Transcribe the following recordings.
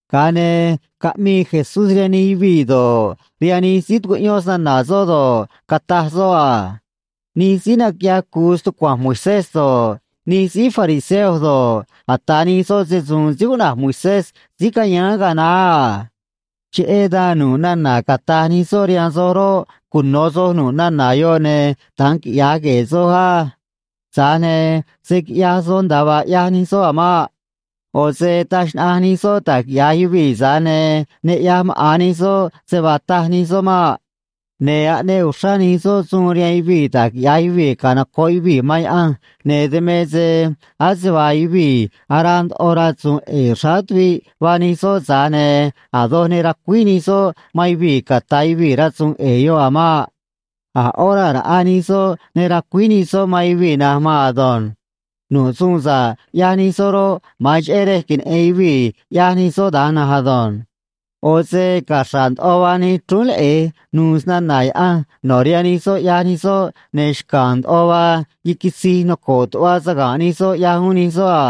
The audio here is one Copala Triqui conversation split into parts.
Ga̱a ne̱ caꞌmii Jesús rihaan nij yuvii̱ do̱ꞌ, rihaan nij síí tucuꞌyón snana̱ soꞌ do̱ꞌ, cataj soꞌ a: ―Nij síí naquiꞌyaj cu̱u stucua̱nj Moisés do̱ꞌ, nij síí fariseo do̱ꞌ, ata̱ nij soꞌ se‑su̱u̱n síí cuꞌna̱j Moisés síí cayáán ga̱a naá a. Cheꞌé dan, nu̱ꞌ nana̱ cata̱j nij soꞌ rihaan soj roꞌ, cuno̱ soj nu̱ꞌ nana̱ yoꞌ, ne̱ da̱nj quiꞌya̱j gue̱e̱ soj á. Tza̱j ne̱ se̱ quiꞌyaj soj nda̱a vaa ꞌyaj nij soꞌ a̱ maꞌ. ꞌO̱ se taj xnaꞌanj nij soꞌ da̱j quiꞌya̱j yuvii̱, tza̱j ne̱ ne ꞌyaj maꞌa̱n nij soꞌ se vaa taj nij soꞌ maꞌ. Ne̱ aꞌneꞌ uxrá nij soꞌ suun rihaan yuvii̱ da̱j quiꞌya̱j yuvii̱ canoco̱ꞌ yuvii̱ man Yaꞌanj, ne̱ dan me se ase vaa yuvii̱ araa ndoꞌo rasu̱u̱n ꞌe̱e̱ xráá tuviꞌ vaa nij soꞌ, tza̱j ne̱ a̱ doj ne racuíj nij soꞌ man yuvii̱ ca̱ta̱ yuvii̱ rasu̱u̱n ꞌe̱e̱ yoꞌ a̱ maꞌ. A̱ ꞌó raa̱ raꞌa nij soꞌ ne racuíj nij soꞌ man yuvii̱ na̱nj maan ado̱nj. Nu̱ꞌ suun sa̱ꞌ ꞌyaj nij soꞌ roꞌ, ma̱an cheꞌé rej queneꞌe̱n yuvii̱ ꞌyaj nij soꞌ da̱nj na̱nj ado̱nj. ꞌO̱ se caxra̱ꞌ ndoꞌo vaa nij chrúún leꞌe̱j nu̱u̱ snana̱ Yaꞌanj no̱ rihaan nij soꞌ, ꞌyaj nij soꞌ, ne̱ xca̱a̱n ndoꞌo vaa yiquitzij noco̱ꞌ tuꞌva saga̱nꞌ nij soꞌ, ꞌyaj uún nij soꞌ a.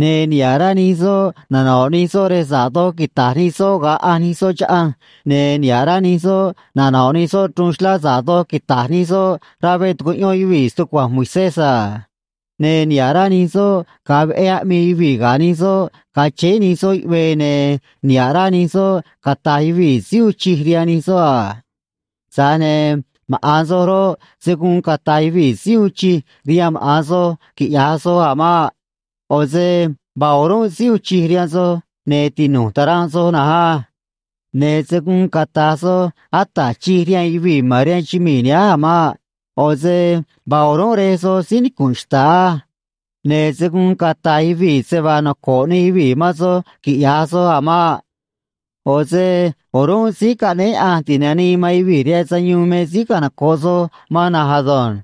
Ne̱ niha̱ꞌ rá nij soꞌ nano̱ꞌ nij soꞌ rej sa̱ꞌ doj quita̱j nij soꞌ ga̱a ꞌanj nij soꞌ chaꞌanj, ne̱ niha̱ꞌ rá nij soꞌ nano̱ꞌ nij soꞌ chruun xlá sa̱ꞌ doj quita̱j nij soꞌ rá veꞌ tucuꞌyón yuvii̱ stucua̱nj Moisés a. Ne̱ niha̱ꞌ rá nij soꞌ ga̱a veꞌé aꞌmii yuvii̱ ga̱ nij soꞌ ga̱a chéé nij soꞌ yuꞌvee, ne̱ niha̱ꞌ rá nij soꞌ cata̱j yuvii̱ Síí uun chij rihaan nij soꞌ a. ’Tza̱j ne̱ maꞌa̱n soj roꞌ, se̱ guun cata̱j yuvii̱ Síí uun chij rihaan maꞌa̱n soj, quiꞌya̱j soj a̱ maꞌ. ꞌO̱ se vaa o̱rúnꞌ síí uun chij rihaan soj, ne̱ tinu̱j ta̱ranꞌ soj na̱nj á. Ne̱ se̱ guun cata̱j soj Ata̱j Chij rihaan yuvii̱ ma̱n rihaan chumii̱ nihánj a̱ maꞌ. ꞌO̱ se vaa o̱rúnꞌ Rej soj síí nicu̱nꞌ xta̱ꞌ á. Ne̱ se̱ guun cata̱j yuvii̱ se vaa noco̱ꞌ nij yuvii̱ man soj, quiꞌya̱j soj a̱ maꞌ. ꞌO̱ se o̱rúnꞌ Síí Caꞌnéé Yaꞌanj Ti̱nanii man Yuvii̱ rihaan Sayuun me síí canoco̱ꞌ soj man na̱nj ado̱nj.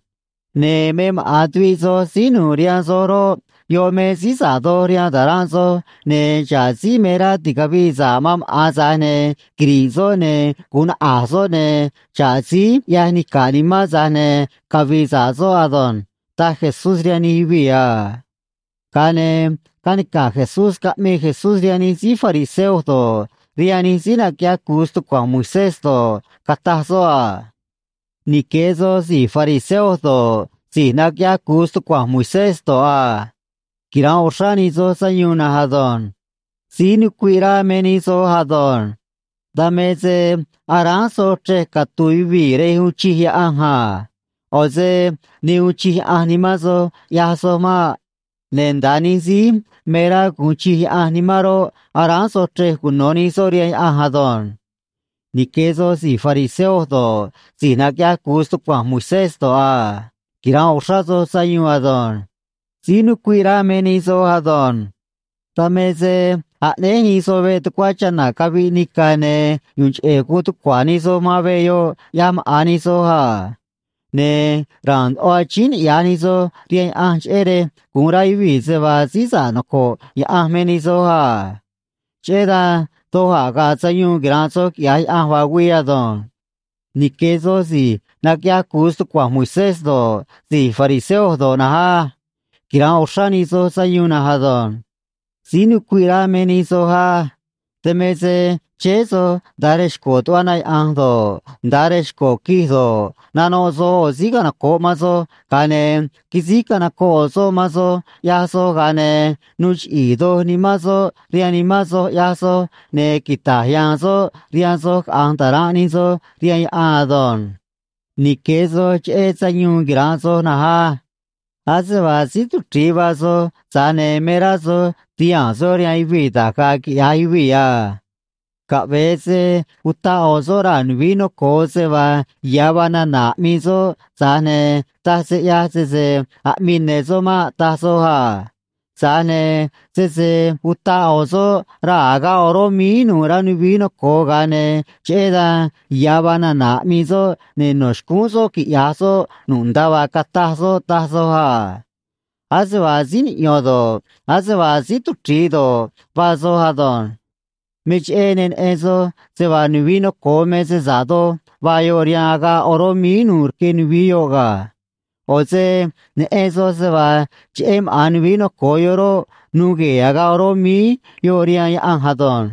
Ne̱ me maꞌa̱n tuviꞌ soj síí nu̱u̱ rihaan soj roꞌ, yoꞌ me síí sa̱ꞌ doj rihaan ta̱ranꞌ soj, ne̱ xa̱ꞌ síí me rá ti̱cavii sa̱ꞌ man maꞌa̱n, tza̱j ne̱ quiri̱ꞌ soꞌ, ne̱ gu̱un naꞌa̱j soꞌ, ne̱ xa̱ꞌ síí ꞌyaj nica̱ꞌ nimán, tza̱j ne̱ cavi̱i̱ sa̱ꞌ soꞌ ado̱nj ―taj Jesús rihaan nij yuvii̱ a. Ga̱a ne̱ canica̱j Jesús caꞌmii Jesús rihaan nij síí fariseo do̱ꞌ, rihaan nij síí naquiꞌyaj cu̱u stucua̱nj Moisés do̱ꞌ, cataj soꞌ a: ―Nique̱ soj si̱j fariseo do̱ꞌ, si̱j naquiꞌyaj cu̱u stucua̱nj Moisés do̱ꞌ a. Quira̱nꞌ uxrá nij soj sayuun na̱nj ado̱nj. Síí nucuiꞌ rá me nij soj ado̱nj. Dan me se aráán soj chrej catu̱u̱ yuvii̱ rej uun chij Yaꞌanj a. ꞌO̱ se ne uun chij Yaꞌanj nimán soj, ꞌyaj soj maꞌ. Ne̱ nda̱a nij síí me rá gu̱un chij Yaꞌanj nimán roꞌ, aráán soj chrej cuno̱ nij soꞌ rihaan Yaꞌanj ado̱nj. ’Nique̱ soj si̱j fariseo do̱ꞌ, si̱j naquiꞌyaj cu̱u stucua̱nj Moisés do̱ꞌ a. Quira̱nꞌ uxrá soj sayuun ado̱nj. Síí nucuiꞌ rá me nij soj ado̱nj. Dan me se aꞌnéj nij soj veꞌ tucuá chana̱ caviꞌ nica̱, ne̱ yu̱u̱n cheꞌe̱ guun tucua̱ nij soj man veꞌ yoꞌ, ꞌyaj maꞌa̱n nij soj a. Ne̱ ra̱a̱n ndoꞌo achíín niꞌya̱j nij soj rihaan Yaꞌanj, cheꞌé rej gu̱un rá yuvii̱ se vaa síí sa̱ꞌ noco̱ꞌ Yaꞌanj me nij soj a. Cheꞌé dan doj a̱ ga̱a̱ sayuun quira̱nꞌ soj quiꞌya̱j Yaꞌanj vaa güii ado̱nj. ’Nique̱ soj si̱j naquiꞌyaj cu̱u stucua̱nj Moisés do̱ꞌ, si̱j fariseo do̱ꞌ na̱nj á. Quira̱nꞌ uxrá nij soj sayuun na̱nj ado̱nj. Síí nucuiꞌ rá me nij soj á. Dan me se chéé soj nda̱a rej xco̱ tuꞌva na yaꞌa̱nj do̱ꞌ, nda̱a rej xco̱ quij do̱ꞌ, nanoꞌ soj ꞌo̱ síí canoco̱ꞌ man soj, ga̱a ne̱ quisíj canocoꞌ ꞌo̱ soꞌ man soj ꞌyaj soj, ga̱a ne̱ nuu chiꞌi̱i̱ doj nimán soꞌ rihaan nimán soj, ꞌyaj soj, ne̱ quita̱j ya̱a̱n soꞌ rihaan soj caꞌa̱nj ta̱ranꞌ nij soj rihaan yaꞌan ado̱nj. ’Nique̱ soj cheꞌé sayuun quira̱nꞌ soj na̱nj á. Ase vaa síí tuchri̱i vaa soj, tza̱j ne̱ me rá soj ti̱haa̱n soj rihaan yuvii̱ da̱j ga̱a̱ quiꞌya̱j yuvii̱ a. Caꞌve̱e se utaꞌ ꞌo̱ soꞌ raa̱ nuvií noco̱o se vaa ya̱ vaa nana̱ aꞌmii soꞌ, tza̱j ne̱ taj se ꞌyaj sese aꞌmii ne̱ soꞌ maꞌ, taj soj a. Tza̱j ne̱ sese utaꞌ ꞌo̱ soꞌ raa̱ agaꞌ oró míí nu̱u̱ rá nuvií noco̱o, ga̱a ne̱ cheꞌé dan ya̱ vaa nana̱ aꞌmii soꞌ, ne̱ no̱ xcúún soꞌ quiꞌya̱j soꞌ nu̱ꞌ nda̱a vaa cataj soꞌ, taj soj a. Ase vaa síí niꞌyo̱n do̱ꞌ, ase vaa síí tuchri̱i do̱ꞌ, vaa soj ado̱nj. Me cheꞌé ne neꞌen soj se vaa nuvií noco̱o me se sa̱ꞌ doj vaa yoꞌ rihaan agaꞌ oró míí nu̱u̱ rque nuvií yoꞌ ga̱. ꞌO̱ se neꞌen soj se vaa cheꞌé maꞌa̱n nuvií noco̱o yoꞌ roꞌ, nuu gue̱e̱ agaꞌ oró míí yoꞌ rihaan Yaꞌanj ado̱nj.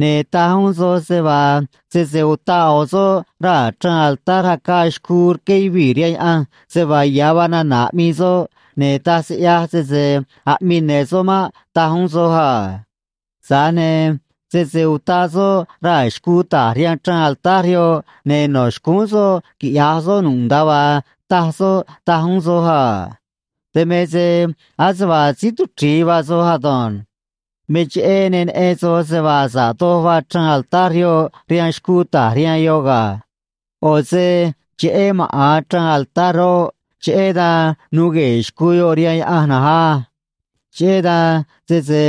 Ne̱ taj uún soj se vaa sese utaꞌ ꞌo̱ soꞌ raa̱ chraan altar acaa xcuu rqué yuvii̱ rihaan Yaꞌanj se vaa ya̱ vaa nana̱ aꞌmii soꞌ, ne̱ taj se ꞌyaj sese aꞌmii ne̱ soꞌ maꞌ, taj uún soj a. Tza̱j ne̱ sese utaꞌ soꞌ raa̱ xcuu ta̱j rihaan chraan altar yoꞌ, ne̱ no̱ xcúún soꞌ quiꞌya̱j soꞌ nu̱ꞌ nda̱a vaa taj soꞌ, taj uún soj a. Dan me se ase vaa síí tuchri̱i vaa soj ado̱nj. Me cheꞌé ne neꞌen soj se vaa sa̱ꞌ doj vaa chraan altar yoꞌ rihaan xcuu ta̱j rihaan yoꞌ ga̱. ꞌO̱ se cheꞌé maꞌa̱n chraan altar roꞌ, cheꞌé dan nuu gue̱e̱ xcuu yoꞌ rihaan Yaꞌanj na̱nj á. Cheꞌé dan sese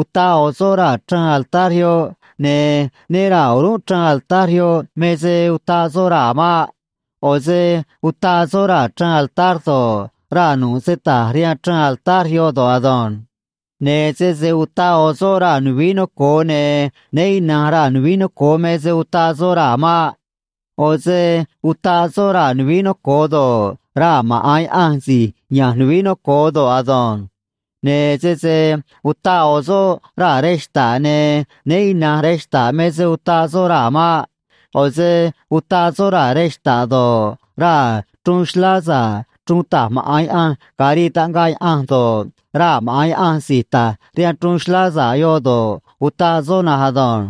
utaꞌ ꞌo̱ soꞌ raa̱ chraan altar yoꞌ, ne̱ né ra̱a o̱rúnꞌ chraan altar yoꞌ me se utaꞌ soꞌ raa̱ maꞌ. ꞌO̱ se utaꞌ soꞌ raa̱ chraan altar do̱ꞌ, raa̱ nu̱ꞌ se ta̱j rihaan chraan altar yoꞌ do̱ꞌ ado̱nj. Ne̱ sese utaꞌ ꞌo̱ soꞌ raa̱ nuvií noco̱o, ne̱ né ina̱nj raa̱ nuvií noco̱o me se utaꞌ soꞌ raa̱ maꞌ. ꞌO̱ se utaꞌ soꞌ raa̱ nuvií noco̱o do̱ꞌ, raa̱ maꞌa̱n Yaꞌanj si̱j ya̱nj nuvií noco̱o do̱ꞌ ado̱nj. Ne̱ sese utaꞌ ꞌo̱ soꞌ raa̱ rej xta̱ꞌ, ne̱ né ina̱nj rej xta̱ꞌ me se utaꞌ soꞌ raa̱ maꞌ. ꞌO̱ se utaꞌ soꞌ raa̱ rej xta̱ꞌ do̱ꞌ, raa̱ chruun xlá sa̱ꞌ chruun ta̱j maꞌa̱n Yaꞌanj ga̱a rii taꞌngaꞌ Yaꞌanj do̱ꞌ, raa̱ maꞌa̱n Yaꞌanj si̱j ta̱j rihaan chruun xlá sa̱ꞌ yoꞌ do̱ꞌ, utaꞌ soꞌ na̱nj ado̱nj.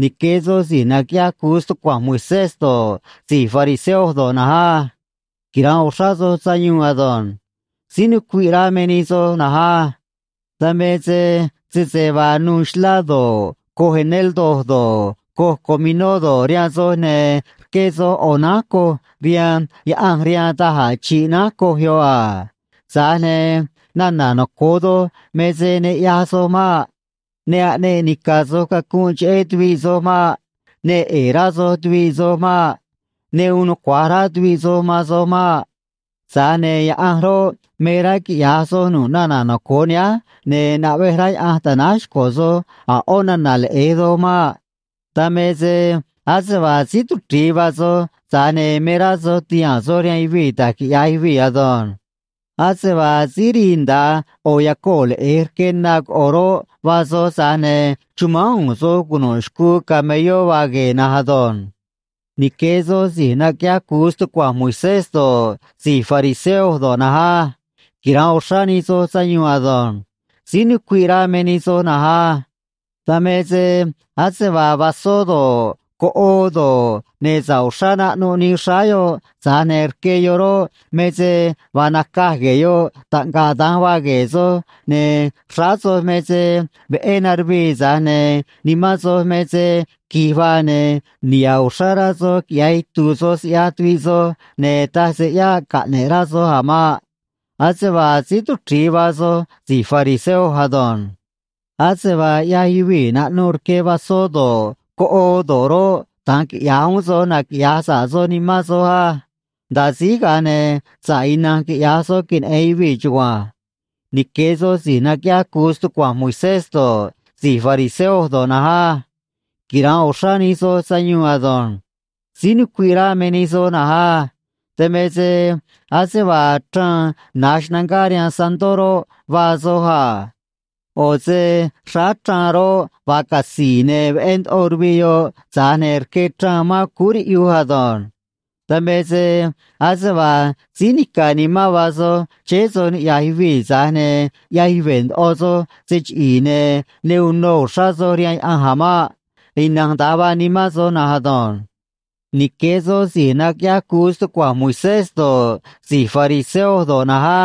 ’Nique̱ soj si̱j naquiꞌyaj cu̱u stucua̱nj Moisés do̱ꞌ, si̱j fariseo do̱ꞌ na̱nj á. Quira̱nꞌ uxrá soj sayuun ado̱nj. Síí nucuiꞌ rá me nij soj na̱nj á. Dan me se sese vaa nuu xlá do̱ꞌ, coj eneldo do̱ꞌ, coj cominó do̱ꞌ, rihaan soj, ne̱ rqué soj ꞌo̱ nánj coj rihaan Yaꞌanj rihaan da̱j a̱ chi̱ꞌ nánj coj yoꞌ a. Tza̱j ne̱ nana̱ noco̱o doj me se ne ꞌyaj soj maꞌ. Ne aꞌneꞌ nica̱ soj cacunꞌ cheꞌé tuviꞌ soj maꞌ. Ne ꞌe̱e̱ rá soj tuviꞌ soj maꞌ. Ne uun nucua̱j rá tuviꞌ soj man soj maꞌ. Tza̱j ne̱ Yaꞌanj roꞌ, me rá quiꞌya̱j soj nu̱ꞌ nana̱ noco̱o nihánj, ne̱ naꞌvej rá Yaꞌanj ta̱náj xco̱ soj a̱ ꞌó nana̱ leꞌe̱j doj maꞌ. Dan me se ase vaa síí tuchri̱i vaa soj, tza̱j ne̱ me rá soj ti̱haa̱n soj rihaan yuvii̱ da̱j quiꞌya̱j yuvii̱ ado̱nj. Ase vaa síí rii nda̱a ꞌo̱ yacoo̱ leꞌe̱j rque na coꞌo̱ roꞌ, vaa soj, tza̱j ne̱ chumánj u̱u̱n soj cunu̱ꞌ xcuu camelló vaa gue̱e̱ na̱nj ado̱nj. ’Nique̱ soj si̱j naquiꞌyaj cu̱u stucua̱nj Moisés do̱ꞌ, si̱j fariseo do̱ꞌ na̱nj á. Quira̱nꞌ uxrá nij soj sayuun ado̱nj. Síí nucuiꞌ rá me nij soj na̱nj á. Dan me se ase vaa vasó do̱ꞌ, coꞌoo do̱ꞌ, ne̱ sa̱ꞌ uxrá naꞌnuꞌ nii xráá yoꞌ, tza̱j ne̱ rque yoꞌ roꞌ, me se vaa nacaj gue̱e̱ yoꞌ, taꞌngaꞌ da̱nj vaa gue̱e̱ soj, ne̱ xráá soj me se veꞌé naruvii, tza̱j ne̱ nimán soj me se qui̱j vaa, ne̱ niha̱ꞌ uxrá rá soj quiꞌya̱j itu̱u̱ soj siꞌyaj tuviꞌ soj, ne̱ taj se ꞌyáꞌ caꞌne̱ꞌ rá soj a̱ maꞌ. Ase vaa síí tuchri̱i vaa soj si̱j fariseo ado̱nj. Ase vaa ꞌyaj yuvii̱ naꞌnuꞌ rque vasó do̱ꞌ, coꞌoo do̱ꞌ roꞌ, da̱nj quiꞌya̱j uún soj, naquiꞌya̱j sa̱ꞌ soj nimán soj á. Nda̱a síj, ga̱a ne̱ sa̱ꞌ ina̱nj quiꞌya̱j soj queneꞌe̱n yuvii̱ chugua̱nj. ’Nique̱ soj si̱j naquiꞌyaj cu̱u stucua̱nj Moisés do̱ꞌ, si̱j fariseo do̱ꞌ na̱nj á. Quira̱nꞌ uxrá nij soj sayuun ado̱nj. Síí nucuiꞌ rá me nij soj na̱nj á. Dan me se ase vaa chraan na̱j xnangá rihaan santó roꞌ, vaa soj a. ꞌO̱ se xráá chraan roꞌ, vaa catzi̱i̱, ne̱ veꞌé ndoꞌo ruviꞌ yoꞌ, tza̱j ne̱ rque chraan mán cúú riꞌyuj ado̱nj. Dan me se ase vaa síí nica̱ nimán vaa soj chéé soj niꞌya̱j yuvii̱, tza̱j ne̱ ꞌyaj yuve̱ ndoꞌo soj se chiꞌi̱i̱, ne̱ ne uno uxrá soj rihaan Yaꞌanj a̱ maꞌ. Ina̱nj da̱nj vaa nimán soj na̱nj ado̱nj. ’Nique̱ soj si̱j naquiꞌyaj cu̱u stucua̱nj Moisés do̱ꞌ, si̱j fariseo do̱ꞌ na̱nj á.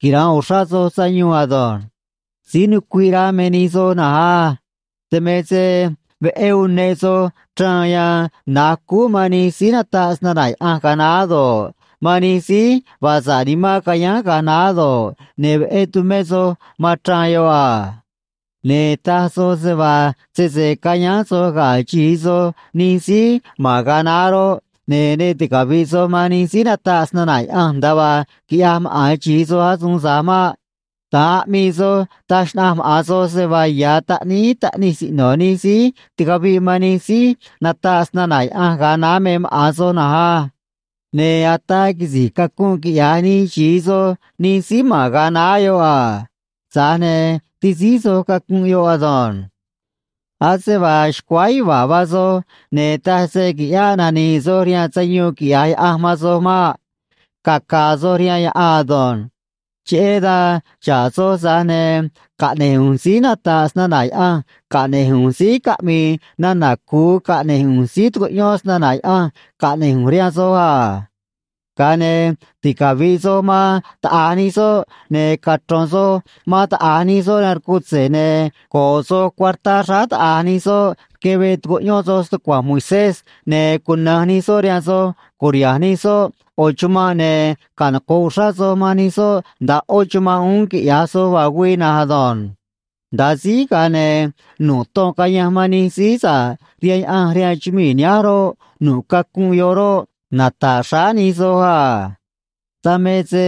Quira̱nꞌ uxrá soj sayuun ado̱nj. Síí nucuiꞌ rá me nij soj na̱nj á. Dan me se veꞌé uneꞌ soj chraan yan na̱j cúú man nij síí nataꞌ snana̱ Yaꞌanj ga̱a naá do̱ꞌ, man nij síí vaa sa̱ꞌ nimán cayáán ga̱a naá do̱ꞌ, ne̱ veꞌé tumé soj man chraan yoꞌ a. Ne̱ taj soj se vaa sese cayáán soj ga̱ xi̱i soj nij síí ma̱n ga̱a naá roꞌ, ne̱ ne ticavi̱ꞌ soj man nij síí nataꞌ snana̱ Yaꞌanj nda̱a vaa quiꞌyaj maꞌa̱n xi̱i soj asuun tza̱j maꞌ. Da̱nj aꞌmii soj, taj xnaꞌanj maꞌa̱n soj se vaa ya̱ taꞌníí taꞌnij siꞌno̱ nij síí ticaviꞌ man nij síí nataꞌ snana̱ Yaꞌanj ga̱a naá me maꞌa̱n soj na̱nj á. Ne̱ ataa quisi̱j cacunꞌ quiꞌyaj nij xi̱i soj nij síí ma̱n ga̱a naá yoꞌ a. Tza̱j ne̱ ti̱síj soj cacunꞌ yoꞌ ado̱nj. ’Ase vaa xcuáá yuva̱a̱ vaa soj, ne̱ taj se qui̱ꞌyáꞌ nani̱i̱ soj rihaan sayuun quiꞌya̱j Yaꞌanj man soj maꞌ. Caca̱a̱ soj rihaan yaꞌan ado̱nj. Cheꞌé dan xa̱ꞌ soj, tza̱j ne̱ caꞌne̱j ꞌu̱nj síí nata̱ꞌ snana̱ Yaꞌanj caꞌne̱j ꞌu̱nj síí caꞌmi̱i̱ nana̱ cu̱u caꞌne̱j ꞌu̱nj síí tu̱cuꞌyón snana̱ Yaꞌanj caꞌne̱j ꞌu̱nj rihaan soj a. Ga̱a ne̱ ticavi̱ꞌ soj man taꞌa̱j nij soꞌ, ne̱ cachro̱n soj man taꞌa̱j nij soꞌ rihaan rcutze̱, ne̱ go̱ꞌ soj cuartá xráá taꞌa̱j nij soꞌ rque veꞌ tucuꞌyón soj stucua̱nj Moisés, ne̱ cuna̱nj nij soꞌ rihaan soj, cu̱riha̱nj nij soꞌ ꞌo̱ chumanꞌ, ne̱ canoco̱ꞌ uxrá soj man nij soꞌ nda̱a ꞌó chumanꞌ uún, quiꞌya̱j soj vaa güii na̱nj ado̱nj. Nda̱a síj, ga̱a ne̱ nu̱ꞌ ton cayanj man nij síí sa̱ꞌ rihaan Yaꞌanj rihaan chumii̱ nihánj roꞌ, nu̱ꞌ cacunꞌ yoꞌ roꞌ, nata̱ꞌ xráá nij soj a. Dan me se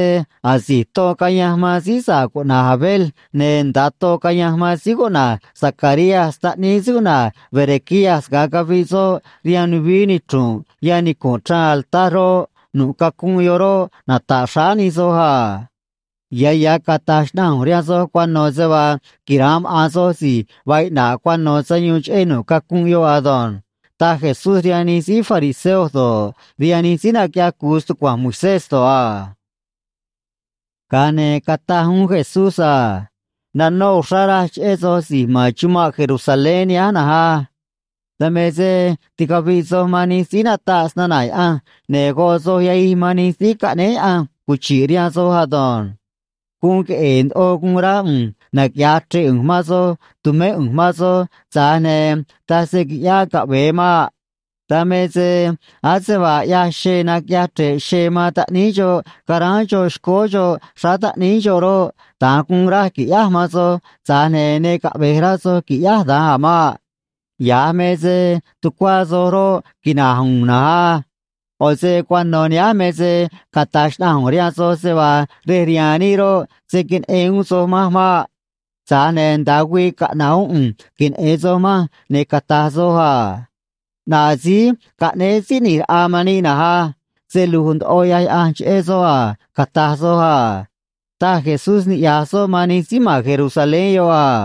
asi̱j ton cayanj man síí sa̱ꞌ cuꞌna̱j Abel ne̱ nda̱a ton cayanj man síí cuꞌna̱j Zacarías taꞌníí síí cuꞌna̱j Berequías ga̱a caviꞌ soꞌ rihaan nuvií nichru̱nꞌ yan nicu̱nꞌ chraan altar roꞌ, nu̱ꞌ cacunꞌ yoꞌ roꞌ, nata̱ꞌ xráá nij soj a. Ya̱ ya̱ cata̱j xnaꞌanj ꞌu̱nj rihaan soj cuano̱ se vaa quira̱nꞌ maꞌa̱n soj si̱j vaa iꞌna̱ꞌ cuano̱ sayuun cheꞌé nu̱ꞌ cacunꞌ yoꞌ ado̱nj ―taj Jesús rihaan nij síí fariseo do̱ꞌ, rihaan nij síí naquiꞌyaj cu̱u stucua̱nj Moisés do̱ꞌ a. Ga̱a ne̱ cataj uún Jesús a: ―Nanó uxrá raj cheꞌé soj si̱j ma̱n chumanꞌ Jerusalén nihánj na̱nj á. Dan me se ticaviꞌ soj man nij síí nataꞌ snana̱ Yaꞌanj, ne̱ goꞌ soj yahij man nij síí caꞌnéé Yaꞌanj cuchi̱ꞌ rihaan soj ado̱nj. Guun queꞌe̱e̱ ndoꞌo guun rá ꞌu̱nj naquiꞌya̱j chre̱ꞌ ꞌu̱nj man soj tu̱mé ꞌu̱nj man soj, tza̱j ne̱ taj se quiꞌyáꞌ caꞌve̱e maꞌ. Dan me se ase vaa ꞌyaj xee naquiꞌyaj chre̱ꞌ xee man taꞌníí xoꞌ ca̱ráán xoꞌ xcóó xoꞌ xráá taꞌníí xoꞌ roꞌ, da̱nj guun raj qui̱ꞌyáj man soj, tza̱j ne̱ ne caꞌve̱j rá soj qui̱ꞌyáj da̱nj a̱ maꞌ. Ya̱j me se tucuá soj roꞌ, quina̱j u̱u̱n na̱nj á. ꞌO̱ se cuano̱ nihánj me se cata̱j xnaꞌanj ꞌu̱nj rihaan soj se vaa rej rihaan níꞌ roꞌ, se̱ queneꞌen uún soj manj maꞌ. Tza̱j ne̱ nda̱a güii caꞌna̱ꞌ uún ꞌu̱nj queneꞌe̱n soj manj, ne̱ cata̱j soj a: “ꞌNaꞌ síí caꞌnéé Síí ꞌNi̱j Raꞌa man níꞌ na̱nj á. Se lu̱j ndoꞌo ꞌyaj Yaꞌanj cheꞌé soꞌ a”, cata̱j soj a ―taj Jesús niꞌya̱j soꞌ man nij síí ma̱n Jerusalén yoꞌ a.